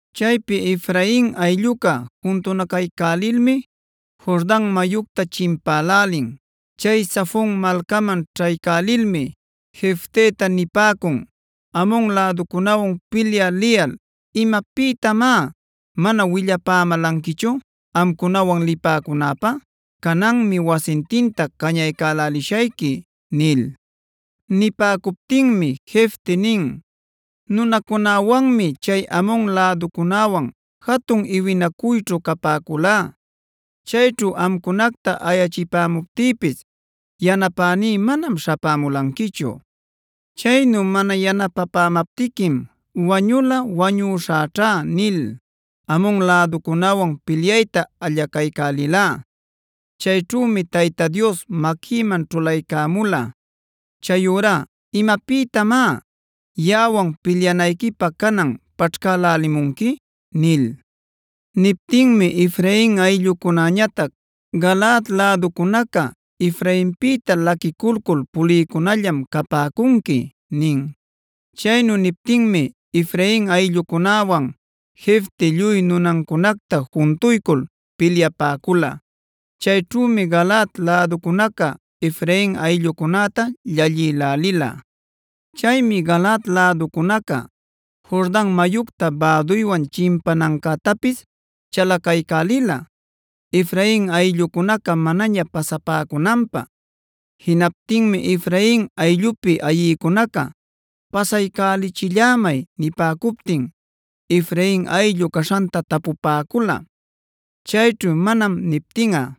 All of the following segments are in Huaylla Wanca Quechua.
Chaypi Efrain aylluca juntunacaycälilmi Jordan mayucta chimpälälin. Chay Zafon malcaman ćhaycälilmi Jefteta nipäcun: “Amon läducunäwan pilyä liyal ¿imapïtamá mana willapämälanquichu amcunawan lipäcunäpä? ¡Cananmi wasintinta cañaycälälishayqui!” nil. Nipäcuptinmi Jefte nin: “Nunäcunawanmi chay Amon läducunäwan jatun iwinacuyćhu capäculá. Chayćhu amcunacta ayachipämuptïpis yanapäní manam śhapämulanquichu. Chaynu mana yanapapämaptiquim ‘wañulꞌa wañuśhäćha’ nil Amon läducunäwan pilyayta allacaycälilá. Chayćhümi Tayta Dios maquïman ćhulaycämula. Chayurá ¿imapïtamá yaꞌawan pilyanayquipä canan paćhcälälimunqui?” nil. Niptinmi Efrain ayllucunäñatac: “Galaad läducunaca Efrainpïta laquiculcul pulïcunallam capäcunqui” nin. Chaynu niptinmi Efrain ayllucunäwan Jefte lluy nunancunacta juntuycul pilyäpäcula. Chayćhümi Galaad läducunaca Efrain ayllucunäta llallïlälila. Chaymi Galaad läducunaca Jordan mayucta bäduywan chimpanancätapis chalacaycälila Efrain ayllucunaca manaña pasapäcunanpä. Jinaptinmi Efrain ayllupi ayïcunaca “pasaycälichillämay” nipäcuptin Efrain ayllu caśhanta tapupäcula. Chayćhu “manam” niptinꞌa: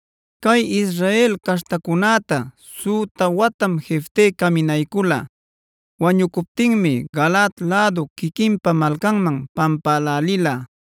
Cay Israel caśhtacunäta süta watam Jefte caminaycula. Wañucuptinmi Galaad lädu quiquinpa malcanman pampälälila.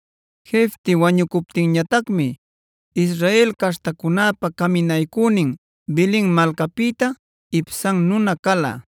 Jefte wañucuptinñatacmi Israel caśhtacunäpa caminaycünin Belen malcapïta Ibzan nuna cala.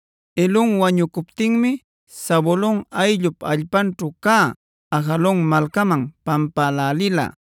Elon wañucuptinmi Zabulon ayllup allpanćhu cä Ajalon malcaman pampälälila.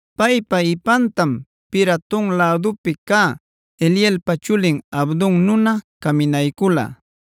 Paypa ipantam Piraton lädupi cä Hilelpa chulin Abdon nuna caminaycula.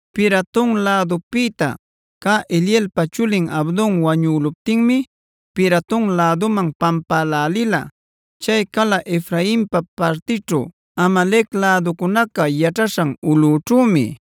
Piraton lädupïta cä Hilelpa chulin Abdon wañüluptinmi Piraton läduman pampälälila. Chay cala Efrainpa partićhu, Amalec läducunaca yaćhaśhan ulꞌućhümi.